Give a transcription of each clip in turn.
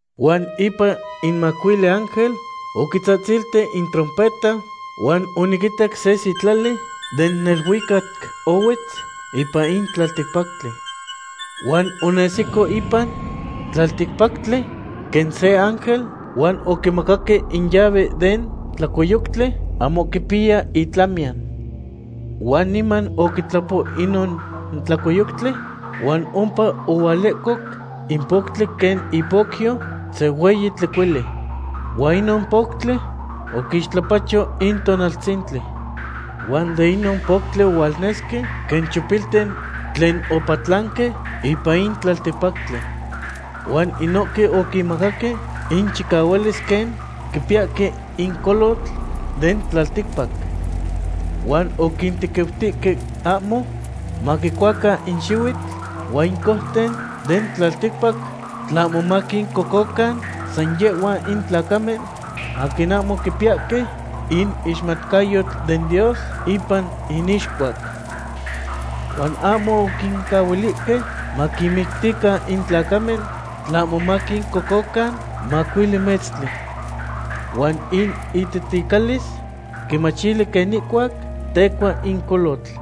Huan ipan in macuili ángel oquitzahtzilti in trompeta huan oniquitac se sitlali den neluicac ohuetz ipan in tlalticpactli. Huan onesico ipan tlalticpactli quen se ángel, huan oquimacaque in llave den tlacoyoctli ahmo quipiya itlamiyan. Huan niman oquitlapo inon tlacoyoctli huan ompa ohualehcoc in poctli quen ipocyo se hueyi tlecuili. Huan inon poctli oquixtlapacho in tonaltzintli. Huan de inon poctli ohualnesque quen chopilten tlen opatlanque ipan in tlalticpactli. Huan inohque oquinmacaque inchicahualis quen quipiyahque in colotl den tlalticpac. Huan oquintequiutihque ahmo maquicuacan in xihuitl huan in couten den tlalticpac, tlahmo maquincococan san yehhuan in tlacamen aquin ahmo quipiyahque in ixmatcayotl den Dios ipan inixcuac. Huan ahmo oquincahuilihque maquinmictican in tlacamen, tlahmo san maquincococan macuili metztli. Huan in ititicalis quimachili quen ihcuac tecua in colotl.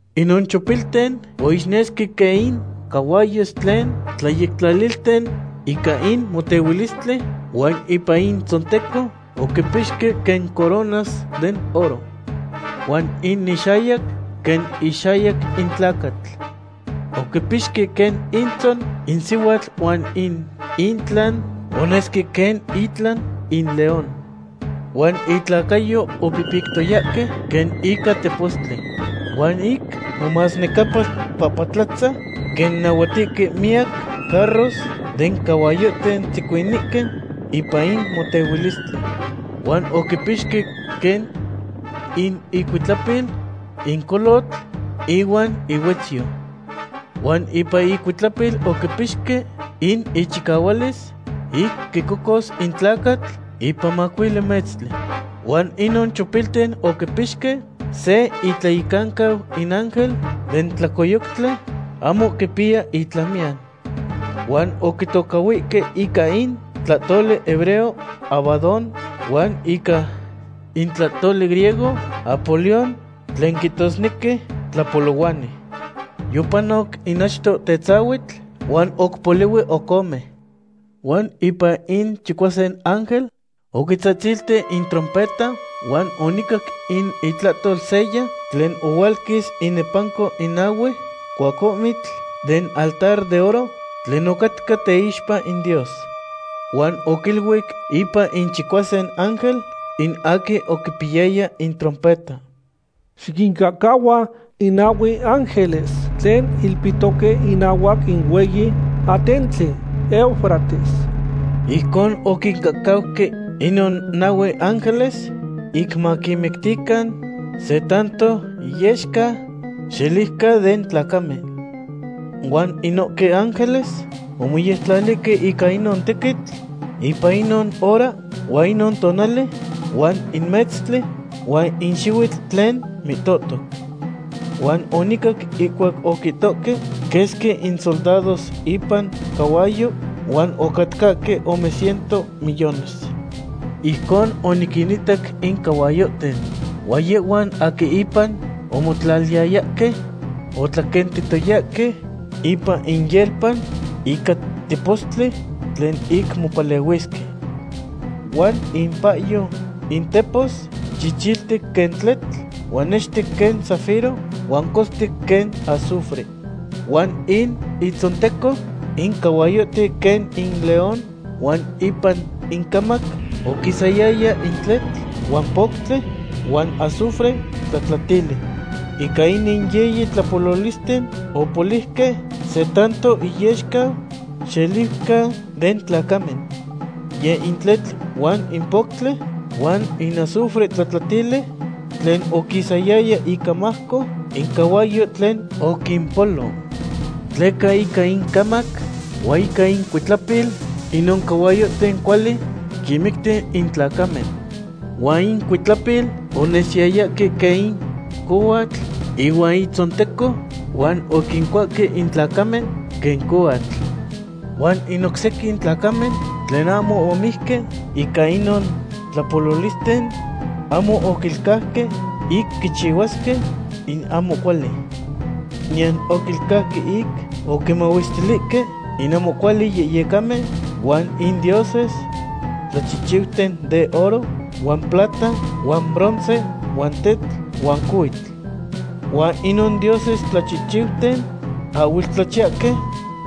Inon chopilten oixnesque quen in cahuayos tlen tlayectlalilten ica in motehuilistli, huan ipan intzonteco oquipixque quen coronas den oro. Huan in inxayac quen ixayac in tlacatl. Oquipixque quen intzon in sihuatl huan in intlan onesque quen itlan in león. Huan itlacayo opihpictoyahque quen ica tepostli. Huan ic momasnecapalpapatlatza quen nahuatihque miyac carros den cahuayohten tzecuinihque ipan in motehuilistli. Huan oquipixque quen in icuitlapil in colotl ihuan ihuetzyo. Huan ipan icuitlapil oquipixque in ichicahualis ic quicocos in tlacatl ipan macuili metztli. Huan inon chopilten oquipixque se intlayecancau in ángel den tlacoyoctli ahmo quipiya itlamiyan. Huan oquitocahhuihque ica in tlahtoli hebreo Abadón, huan ica in tlahtoli griego Apolión, tlen quihtosnequi tlapolohuani. Yopanoc in achto tetzahuitl, huan oc polihui oc ome. Huan ipan in chicuasin ángel oquitzahtzilti in trompeta huan onicac in itlahtol seya tlen ohualquis inepanco in nahue cuacohmitl den altar den oro tlen ocatca teixpa in Dios. Huan oquiluic ipan in chicuasin ángel, in aquin oquipiyaya in trompeta: ―Xiquincahcahua in nahue ángeles tlen ilpihtoque inahuac in hueyi atentli Eufrates. Ijcon oquincahcauque inon nahue ángeles ic maquinmictican se tanto iyexca xeliuca den tlacamen. Huan inohque ángeles omoyectlalihque ica inon tequitl ipan inon hora huan in tonali huan in metztli huan in xihuitl tlen mihtohtoc. Huan onicac ihcuac oquihtohque quesqui in soldados ipan cahuayo, huan ocatcahque ome ciento millones. Ijcon oniquinitac in cahuayohten. Huan yehhuan aquin ipan omotlaliyayahque otlaquentihtoyahque ipan inyelpa ica tepostli tlen ic mopalehuisque. Huan impahyo intepos chichiltic quen tletl huan nextic quen zafiro huan costic quen azufre. Huan in itzonteco in cahuayohten quen in león huan ipan incamac oquisayaya in tletl huan poctli huan azufre tlatlatili. Ica inin yiyi tlapololisten opoliuque se tanto iyexca xeliuca den tlacamen. Yeh in tletl huan in poctli huan in azufre tlatlatili tlen oquisayaya icamajco in cahuayo tlen oquimpolo. Tleca ica incamac huan ica incuitlapil inon cahuayohten cuali quinmicti in tlacamen. Huan incuitlapil onesiyayahque quen in cohuatl ihuan itzonteco, huan oquincuahque in tlacamen quen cohuatl. Huan in oc sequin tlacamen tlen ahmo omijque ica inon tlapololisten ahmo oquilcauque ic quichihuasque in ahmo cuali. Niyan oquilcauque ic oquimahuestilihque in ahmo cuali yehyecamen huan in dioses tlachihchiuten den oro huan plata huan bronce huan tetl huan cohuitl. Huan inon dioses tlachichiuten ahhuel tlachiyahque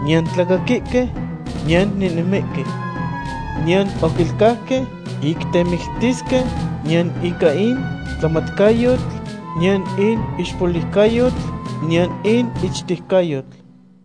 niyan tlacaquihque niyan nehnemihque. Niyan oquilcauque ic temictisque, niyan ica in tlamatcayotl, niyan in ixpoliucayotl, niyan in ichtejcayotl.